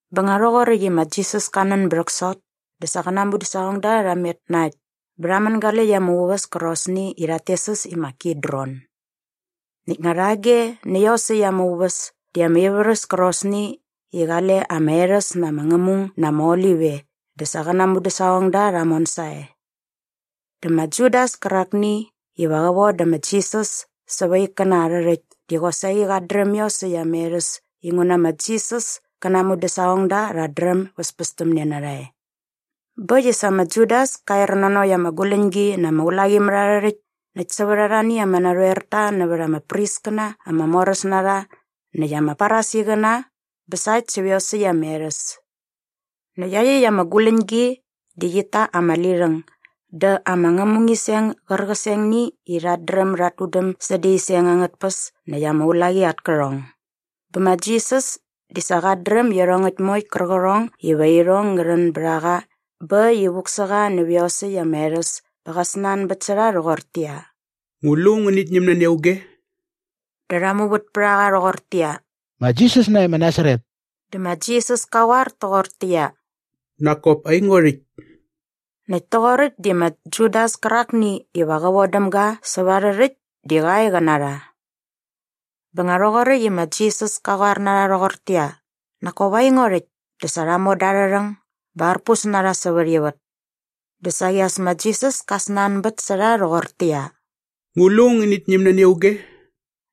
Bä nga rhoqoräkt i ma Jisas kä nän bä rhäksot dä sa qä na aa mudäsaqongda rha met na äkt bä rha mängaläkt ama uväs kärqosni i rhat tes äs i ma Kidron. Näkt nga rhage nä iosäkt ama uväs di ama ivärhäs kärqosni i qale ama erhäs na ama ngämung na ama olip e dä sa qä na aa mudäsaqongda rha mon sae. Dä ma Judas kärakni iva qä vodä ma Jisas säva aa ikkäna arhä rhäkt di qosaqi qat dräm iosäkt ama erhäs inguna ma Jisas kä na aa mudäsaqongda rhät dräm bäspästämne na rha e. Bä äkt i sa ma Judas ka er nanokt ama guläñgi na ama ulaqimärharhärhäkt näkt sävät arhani ama narhoerta nävät ama priskäna ama moräs na rha näkt ama Farisiqäna bä sa äkt sävät iosäkt ama erhäs. Näkt iaqyäkt ama guläñgi di rhit ta ama lirhäng dä ama ngämungiseng gärqisengni i rhat dräm dat tudäm sädä iseng angät tpäs näkt ama ulaqi at kärhong. Bä ma Jisas di sa qat dräm iarhongäkt moe qärqärhong iva irhong ngä rhän bät a qa bä äkt i vuk sä qa nävä iosäkt ama erhäs bä qa snanbät sä rha rhoqortäqyia, “Ngu lu ngänit ñäm nani auge?” Dä rha muvät pät a qa rhoqortäqyia, “Ma Jisas nae ma Nasaret.” Dä ma Jisas ka qoar toqortäqyia, “Nak kop aingo rhäkt.” Näkt toqoräkt di ma Judas kärakni iva qä vodäm ga säva arhä rhäkt di qa e qä na rha. Bä nga rhoqoräkt i ma Jisas ka qoar na rha rhoqortäqyia, “Nak kop aingo rhäkt” dä sa rha moda arha rhäng bä arpus na rha sävät ivät. Dä saqi as ma Jisas ka snanbät sä rha rhoqortäqyia, “Ngu lu ngänit ñäm nani auge?”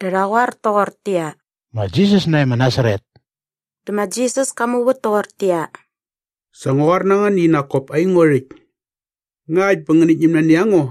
Dä rha qoar toqortäqyia, “Ma Jisas nae ma Nasaret.” Dä ma Jisas ka muvät toqortäqyia, “Sa ngua qoar na ngän i nak kop aingo rhäkt. Ngakt bä ngänit ñäm nani a ngo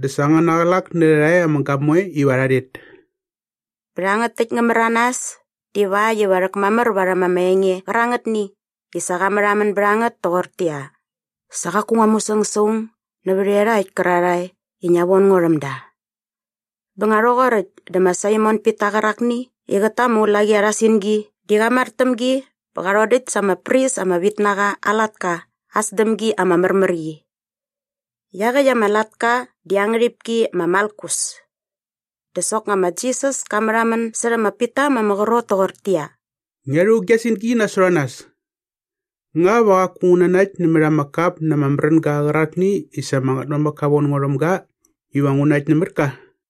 dä sa angäna qlak nä rhärha e ama gamoe iva rha rhet.” Bä rhangät täkt ngä märanas divakt iva rhäkmamär varhäm ama enge qärangätni i sa qa märhamän bät a ngät toqortäqyia, “Sa qaku ngua musäng sa aung nävät iarhakt kärarhae i ngia von ngo rhäm da.” Bä nga rhoqoräkt dä ma Saimon Pita qärakni i qät ta ama ulaqi arha singi di qa mar täm gi bä qa rhodäkt sa ama pris ama vit na qa aa latka aa sdämgi ama märmär qi. Iaqäkt ama latka di aa ngärhipki ma Malkus. Dä soknga ma Jisas ka märhamän särhä ma Pita ma ama qrot toqortäqyia, “Ngia rhu gia singi nasot a nas! Nga va qaku ngu nanakt nämät ama kap na ama märänga qärakni i sa ama Ngätmamäk ka von ngo rhäm ga iva ngu nakt nämät ka?”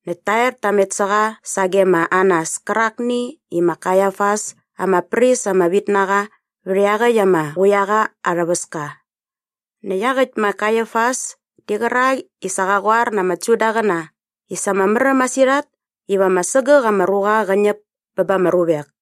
näkt ta er ta met sä qa sage ma Anas kärakni i ma Kaiafas ama pris ama vit na qa vät iaqäkt ama quiaqa aa rhäväska. Näkt iaqäkt ma Kaiafas di qärak i sa qa qoar na ama Judaqäna i sa ama märäm masirhat iva ama sägäk ama ruqa qä ñäp bä ba ama ruvek.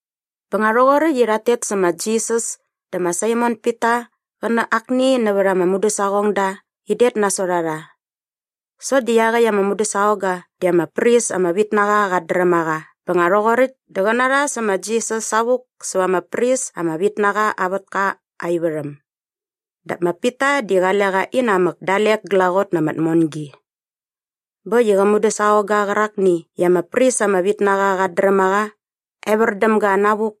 Bä nga rhoqoräkt i rhat tet sä ma Jisas dä ma Saimon Pita qä na akni nävät ama mudäsaqongda in det nasot a rha. Sokt di iaqäkt ama mudäsaqongga di ama pris ama vit na qa qat dräm a qa bä nga rhoqoräkt dä qä na rha sä ma Jisas savuk säva ama pris ama vit na qa aa vätka aa ivärhäm dap ma Pita di qale qa inamäk dalek glaqot na ama tmongi. Bä äkt i qä mudäsaqongga qärakni i ama pris ama vit na qa qat dräm a qa evär däm ga navuk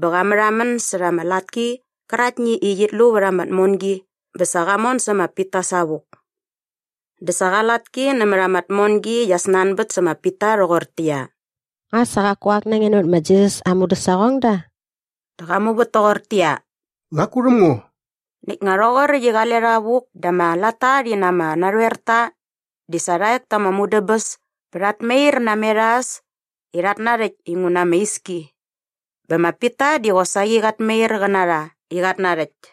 bä qa märhamän särha ama latki qäraktni i qit lu vät ama tmongi bä sa qa mon sä ma Pita savuk. Dä sa qa latki nämät ama tmongi qia snanbät sä ma Pita rhoqortäqyia, “Nga sa qaku ak na nge nävät ma Jisas aa mudäsaqongda?” Dä qa muvät toqortäqyia, “Qaku rhäm ngo.” Näkt nga rhoqoräkt i qale rha vuk dä ama latta rhi na ama narhoerta di sa rha ek ta ama mudäbäs bä rhat mair namet a äs i rhat narhäkt inguna ama iski. Bä ma Pita di qosaqi qat mair qä na rha i qat narhäkt.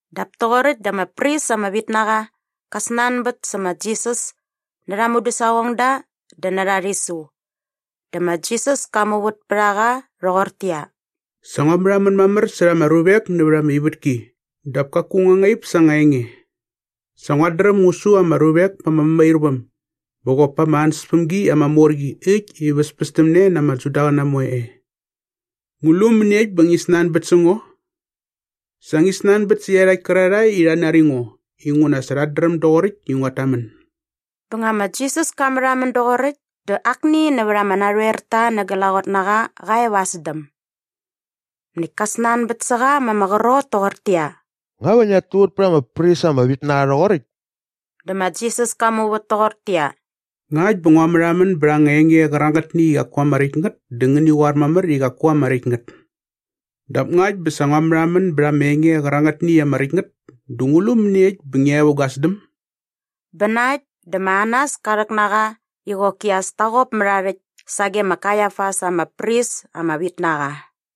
Dap toqoräkt dä ama pris ama vit na qa kä snanbät sä ma Jisas närha aa mudäsaqongda dä närha aa rhisu. Dä ma Jisas ka muvät pät a qa rhoqortäqyia, “Sa ngua märhamän mamär särha ama ruvek nävät ama ivätki dap kaku ngua ngaip sa anga enge. Sa nguat dräm ngu su ama ruvek pa ama mämairväm bä qop pa ama ansäspämgi ama mor qi äkt i väspästämne ama Judaqäna moe e. Ngu lu mäniekt bä ngi snanbät sä ngo? Sa ngi snanbät sä iarhakt kärarhae i rha nari ngo inguna sa rhät dräm doqoräkt i nguat tamän.” Bä nga ma Jisas ka märhamän doqoräkt dä akni nävät ama narhoerta na glaqot na qa qa e va aa sdäm. Näkt ka snanbät sä qa ma ama qrot toqortäqyia, “Nga va ngiat tuvät pät ama pris ama vit na qa rhoqoräkt?” Dä ma Jisas ka muvät toqortäqyia, “Ngakt bä ngua märhamän bät anga enge qärangätni i qaku ama räkt ngät dä ngäni qoar mamär i qaku ama räkt ngät. Dap ngakt bä sa ngua märhamän bät ama enge qärangätni i ama räkt ngät dä ngu lu mäniekt bä ngia e vä gua sdäm?” Bä na äkt dä ma Anas ka rhäk na qa i qoki as ta qop mät aa rhäkt sage ma Kaiafas ama pris ama vit na qa.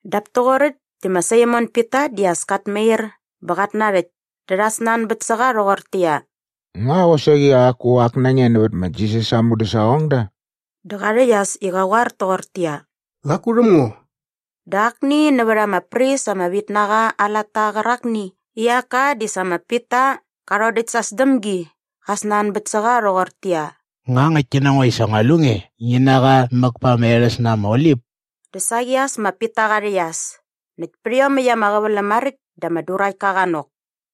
Dap toqoräkt dä ma Saimon Pita di as kat mair bä qat narhäkt dä rha snanbät sä qa rhoqortäqyia, “Nga qosaqi qaku ak na nge nävät ma Jisas aa mudäsaqongda?” Dä qa rhäqyas i qa qoar toqortäqyia, “Qaku rhäm ngo.” Dä akni nävät ama pris ama vit na qa aa latta qärakni i aa aka di sa ma Pita qa rhodäkt sa aa sdämgi qa snanbät sä qa rhoqortäqyia, “Nga ngäktki na ngo i sa ngua lu nge ngi na qa mäk pa ama erhäs na ama olip?” Dä saqi as ma Pita qa rhäqyas näkt pät iomäkt ama qäväläm maräkt dä ama duraktka qa nok.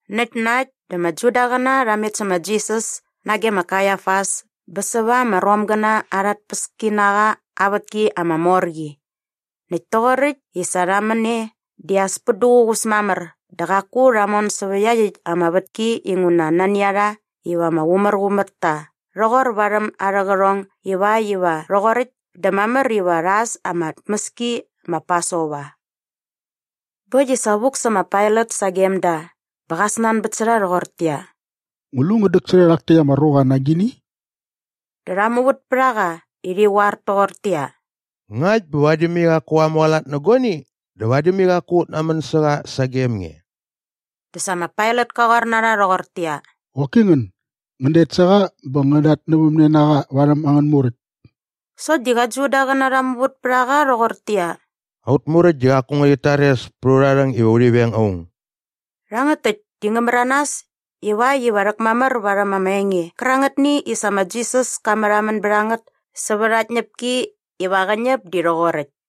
Näkt na äkt dä ama Judaqäna rha met sä ma Jisas nage ma Kaiafas bä säva ama Romgäna arha tpäskinaqa aa vätki ama mor qi. Näkt toqoräkt i sa rha män e di as pät duququs mamär dä qaku rha mon sävä iaqyäkt ama vätki inguna nani a rha iva ama qumärqumär ta rhoqor varhäm arhä qärhong ivakt iva rhoqoräkt dä mamär iva rha äs ama tmäski ma Pasova. Bä äkt i sa vuk sä ma Pailat sagem da bä qa snanbät sä rha rhoqortäqyia, “Ngu lu ngän däksärhä rhak täkt ama ruqa na agini?” Dä rha muvät pät a qa i rhi qoar toqortäqyia, “Ngakt bä vadi mai qaku qa mualat nä guani dä vadi mai qaku ut namän sä qa sagem nge.” Dä sa ma Pailat ka qoar na rha rhoqortäqyia, “Qoki ngän, ngän det sä qa bä ngän datnävämne na qa varhäm angän muräkt.” Sokt di qä Judaqäna rha muvät pät a qa rhoqortäqyia, “Aut Muräkt di qaku ngärhit tares pät urha rhäng iva urhi veng aung.” Rhangät täkt di ngä märanas ivakt iva rhäkmamär varhäm ama enge qärangätni i sa ma Jisas ka märhamän bät a ngät sävät aa tñäpki iva qä näp di rhoqoräkt.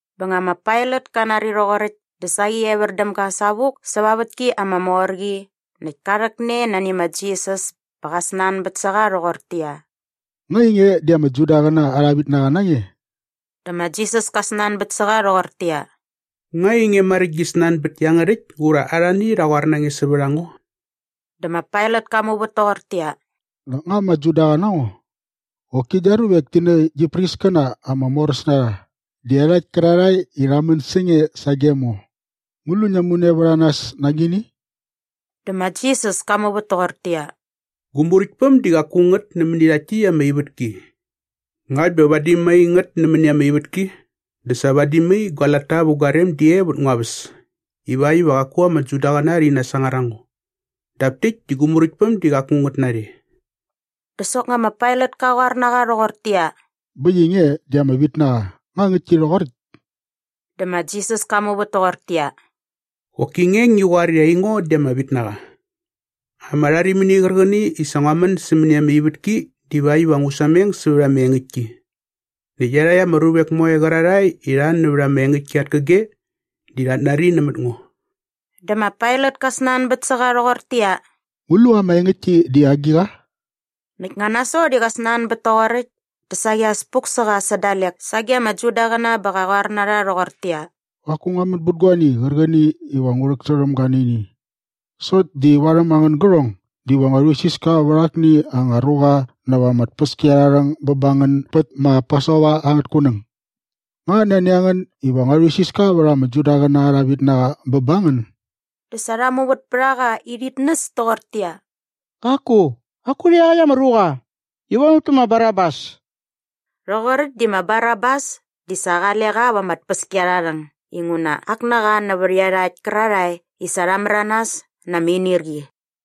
Bä nga ma Pailat ka nari rhoqoräkt dä saqi evär däm ga savuk säva aa vätki ama mor qi näkt ka rhäkne nani ma Jisas bä qa snanbät sä qa rhoqortäqyia, “Nga ainge di ama Judaqäna arha vitnaqa na nge?” Dä ma Jisas ka snanbät sä qa rhoqortäqyia, “Nga ainge maräkt gi snanbät iangärhäkt ura arhani rha qoar na nge sävät a ngo?” Dä ma Pailat ka muvät toqortäqyia, “Nak nga ama Judaqa na ngo? Qoki gia ruvek ti nä gi priskäna ama moräs na rha di iarhakt kärarhae i rha män sä nge sagem ngo. Ngu lu ngia mune vät a nas na agini?” Dä ma Jisas ka muvät toqortäqyia, “Gu muräktpäm di qaku ngät nämäni rhakt täkt ama ivätki. Ngakt bä vadi mai ngät nämäni ama ivätki dä sa vadi mai gua latta vä gua rem di e vät ngua väs ivakt iva qaku ama Judaqäna rhi nasangar a ngo. Dap täkt di gu muräktpäm di qaku ngät narhe.” Dä soknga ma Pailat ka qoar na qa rhoqortäqyia, “Bä äkt i nge di ama vitnaqa. Nga ngäktki rhoqoräkt?” Dä ma Jisas ka muvät toqortäqyia, “Qoki nge ngi qoar i aingo di ama vitnaqa. Ama rharimini qärqäni i sa ngua män sämäni ama ivätki divakt iva ngu sameng sävät ama engäktki. Näkt iarhakt ama ruvek moe qärarhae i rha nävät ama engäktki at käge di rhat nari nämät ngo.” Dä ma Pailat ka snanbät sä qa rhoqortäqyia, “Ngu lu ama engäktki di agiqa?” Näkt nga nasot i qa snanbät toqoräkt dä saqi as puk sä qa sä dalek sage ama Judaqäna bä qa qoar na rha rhoqortäqyia, “Qaku ngua män bät guani qärqäni iva ngu rhäksärhäm ga nä ini. Sokt di varhäm angän gärhong diva ngua rhuisiska vät akni anga ruqa näva ama tpäskiarharhäng bä ba ngän bät ma Pasova angät kunäng. Nga nani a ngän iva ngua rhuisiska vät ‘ama Judaqäna arha vitnaqa’ bä ba ngän?” Dä sa rha muvät pät a qa i rhit näs toqortäqyia, “Qaku, qaku rhä iaqäkt ama ruqa! Ngi von ut tä ma Barabas!” Rhoqoräkt di ma Barabas di sa qale qa va ama tpäskiarharhäng inguna ak na qa nävät iarhakt kärarhae i sa rha märanas na ama inirqi.